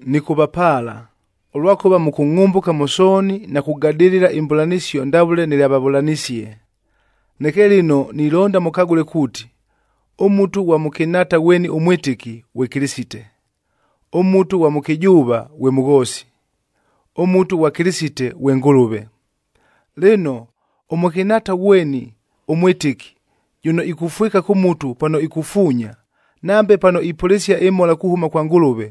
Nɨkʉvapaala, ʉlwakʉva mʉkʉngʼhʉmbʉka mʉ sooni na kugadɨlɨla imbʉlanɨsio ndavʉle nɨlyavavʉlanisie. Neke lɨno nilonda mʉkagʉle kuuti, ʉmutua ghwa mʉkɨnhaata ghweni ʉmwɨtɨki, ghwe Kɨlɨsite; ʉmutu ghwa mʉkɨjʉʉva, ghwe mʉghoosi; ʉmutu ghwa Kɨlɨsite, ghwe Ngʉlʉve. Lɨno, ʉmʉkɨnhaata ghweni ʉmwɨtɨki jʉno ikufwɨka kʉ mutu pano ikufuunya, nambe pano ipʉlɨsia ɨmhola kuhʉma kwa Ngʉlʉve,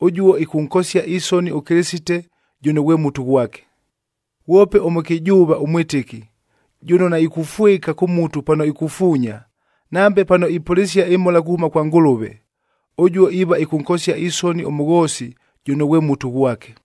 ʉjuo ɨkʉnkosia isoni ʉKɨlɨsite jʉno ghwe mutu ghwake. Ghwope ʉmʉkɨjʉʉva ʉmwɨtɨki jʉno naikufwɨka kʉ mutu pano ikufuunya, nambe pano ipʉlɨsia ɨmhola kuhʉma kwa Ngʉlʉve, ʉjuo iiva ɨkʉnkosia isoni ʉmʉghoosi jʉno ghwe mutu ghwake,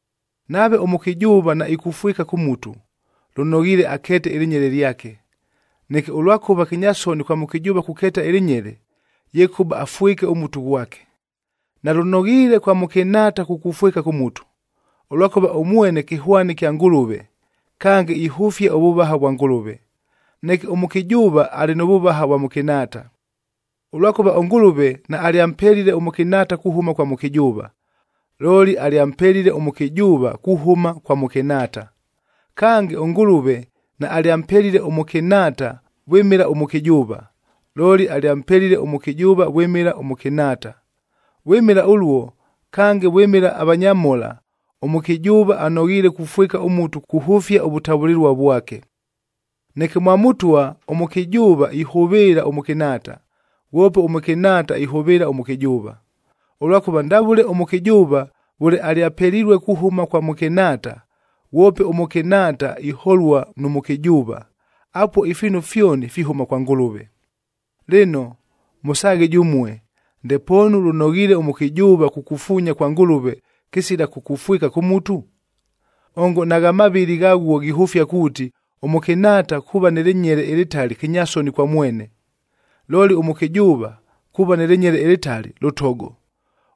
Nave ʉmʉkɨjʉʉva naikufwɨka kʉ mutu, lʉnoghiile akeete ɨlɨnyele lyake. Neke ʉlwakʉva kɨnyasoni kwa mʉkɨjʉʉva kukeeta ɨlɨnyele, yekʉba afwɨke ʉmutu ghwake. Nalʉnoghiile kwa mʉkɨnhaata kukufwɨka kʉ mutu, ʉlwakʉva ʉmwene kɨhwani kya Ngʉlʉve, kange ihʉfia ʉvʉvaha vwa Ngʉlʉve. Neke ʉmʉkɨjʉʉva alɨ nʉ vʉvaha ʉvwa mʉkɨnhaata. Ʉlwakʉva ʉNgʉlʉve naalyampelile ʉmʉkɨnhaata kuhʉma kwa mʉkɨjʉʉva, looli alyampelile ʉmʉkɨjʉʉva kuhʉma kwa mʉkɨnhaata. Kange, ʉNgʉlʉve naalyampelile ʉmʉkɨnhaata vwɨmɨla ʉmʉkɨjʉʉva, looli alyampelile ʉmʉkɨjʉʉva vwɨmɨla ʉmʉkɨnhaata. Vwɨmɨla ʉluo, kange vwɨmɨla avanyamhola, ʉmʉkɨjʉʉva anoghiile kufwɨka ʉmutu kuhʉfia ʉvʉtavʉlɨlua vwake. Neke mwa Mʉtwa, ʉmʉkɨjʉʉva ihʉvɨɨla ʉmʉkɨnhaata, ghwope ʉmʉkɨnhaata ihʉvɨɨla ʉmʉkɨjʉʉva. Ʉlwakʉva ndavʉle ʉmʉkɨjʉʉva vʉle alyapelilue kuhʉma kwa mʉkɨnhaata, ghwope ʉmʉkɨnhaata iholua nʉ mʉkɨjʉʉva, apuo ifiinu fyoni fihʉma kwa Ngʉlʉve. Lɨno mʉsaaghe jʉmue, ndepoonu lʉnoghiile ʉmʉkɨjʉʉva kukufuunya kwa Ngʉlʉve kɨsila kukufwɨka kʉ mutu? Ongo nagha mavɨlɨ ghaghuo ghihʉfia kuuti, ʉmʉkɨnhaata kuuva nɨ lɨnyele ɨlɨtali kɨnyasoni kwa mwene! Looli ʉmʉkɨjʉʉva kuuva nɨ lɨnyele ɨlɨtali lʉtogo,c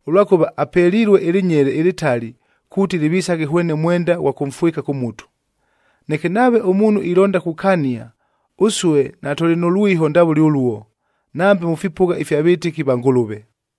ʉlwakʉva apelilue ɨlɨnyele ɨlɨtali kuuti lɨvisaghe hwene mwenda ghwa kʉmfwɨka kʉ mutu. Neke nave ʉmuunhu ilonda kukania, ʉsue natʉlɨ nʉ lwiho ndavʉle ʉluo, nambe mʉ fipʉgha ifya vɨtɨki va Ngʉlʉve.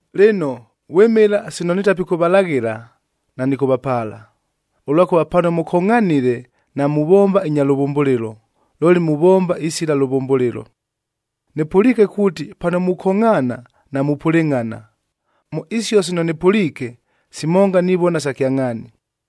Lɨno, vwɨmɨla sino nitapikʉvalaghɨla, nanɨkʉvapaala, ʉlwakʉva pano mʉkongʼhanile namuvomba inya lʉvʉmbʉlɨlo, looli muvomba isila lʉvʉmbʉlɨlo. Nɨpʉliike kuuti pano mukongʼhaana, namupʉlɨngʼhana. Mʉ isio sino nɨpʉliike, simonga nivona sa kyangʼhaani.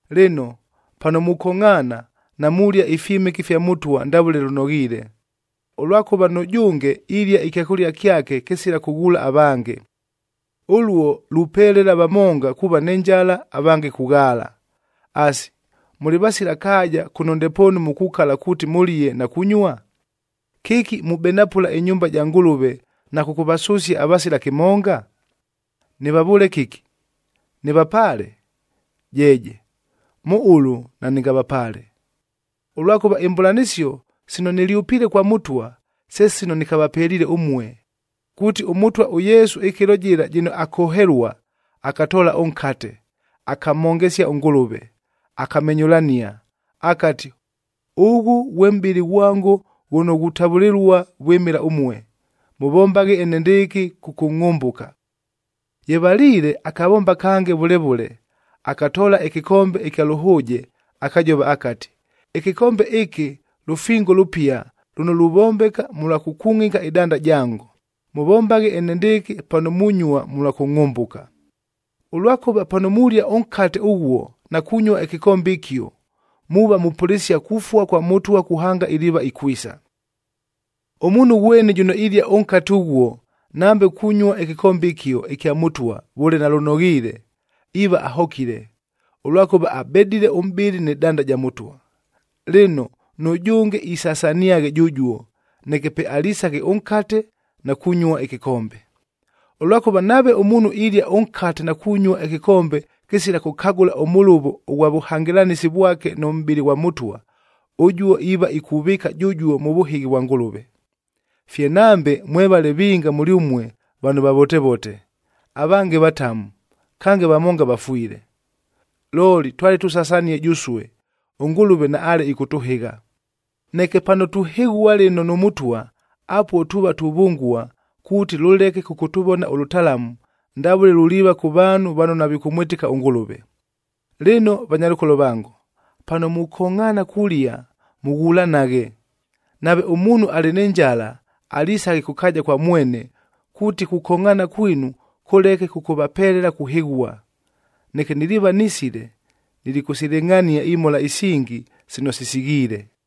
Lɨno, pano mukongʼhaana, namulia ifyɨmɨke ifya Mʉtwa ndavʉle lʉnoghiile, ʉlwakʉva nʉjʉnge ilia ɨkyakʉlia kyake kɨsila kʉghuula avange. Ʉluo lupelela vamonga kuuva nɨ njala, avange kughaala. Asi, mʉlɨ vasila kaaja kʉno ndepoonu mukukala kuuti mʉlie na kunyua? Kɨki mubenapʉla ɨnyumba ja Ngʉlʉve na kʉkʉvasʉsia avasila kɨmonga? Nɨvavʉʉle kɨki? Nɨvapaale? Jeeje! Mʉ ʉlʉ nanɨngavapaale. Ʉlwakʉva imbʉlanɨsio sino nɨlyʉpiile kwa Mʉtwa, se sino nɨkavapeliile ʉmue, kuuti ʉMʉtwa ʉYesu ɨkɨlo jɨla jɨno akohelua, akatoola ʉnkate, akamhongesia ʉNgʉlʉve, akamenyʉlania, akati, “Ʉghʉ ghwe mʼbɨlɨ ghwango ghʉno ghutavʉlɨlua vwɨmɨla ʉmue, mʉvombaghe enendɨɨkɨ kʉkʉngʼhʉmbʉka.” Ye valiile akavomba kange vʉle vʉle, akatoola ɨkɨkombe ɨkya lʉhʉʉjed akajova akati, “Ɨkɨkombe ɨkɨ lʉfingoe lʉpia lʉno luvombeka mʉlwa kʉkungʼika ɨdanda jango, mʉvombaghe enendɨɨkɨ pano munyua mʉlwa kʉngʼhʉmbʉka.” Ʉlwakʉva pano mulia ʉnkate ʉghuo na kunyua ɨkɨkombe ɨkio, muuva mupʉlɨsia kufua kwa Mʉtwa kuhanga iliiva ikwisa. Ʉmuunhu ghweni jʉno ilia ʉnkate ʉghuo nambe kunyua ɨkɨkombe ɨkio ɨkya Mʉtwa vʉle nalʉnoghiile, iiva ahokile, ʉlwakʉva abedile ʉmʼbɨlɨ nɨ danda ja Mʉtwa. Lɨno, nʉjʉnge isasaniaghe jʉjuo, neke pe alisaghe ʉnkate na kunyua ɨkɨkombe. Ʉlwakʉva nave ʉmuunhu ilia ʉnkate na kunyua ɨkɨkombe kɨsila kʉkagʉla ʉmʉlʉvo ʉghwa vʉhangɨlanɨsi vwake nʉ mʼbɨlɨ ghwa Mʉtwa, ʉjuo iiva ikuvɨɨka jʉjuo mʉ vʉhɨghi vwa Ngʉlʉve. Fye nambe mwevale vinga mʉlyʉmue vano vavotevote, avange vatamu, kange vamonga vafwile. Looli twale tusasanie jʉsue, ʉNgʉlʉve naale ɨkʉtʉhɨgha. Neke pano tuhɨghua lɨno nʉ Mʉtwa, apuo tuuva tuvʉngua kuuti lʉleke kʉkʉtʉvona ʉlʉtalamu, ndavʉle luliiva kʉ vaanhu vano navikʉmwɨtɨka ʉNgʉlʉve. Lɨno vanyalʉkolo vango, pano mukongʼhaana kulia, mʉghulanaghe. Nave ʉmuunhu alɨ nɨ njala, alisaghe kʉ kaaja kwa mwene kuuti kukongʼhaana kwinu kʉleke kʉkʉvapelela kuhɨghua. Neke niliiva nisile, nilikʉsilɨngʼhania imhola isingi sino sisighiile.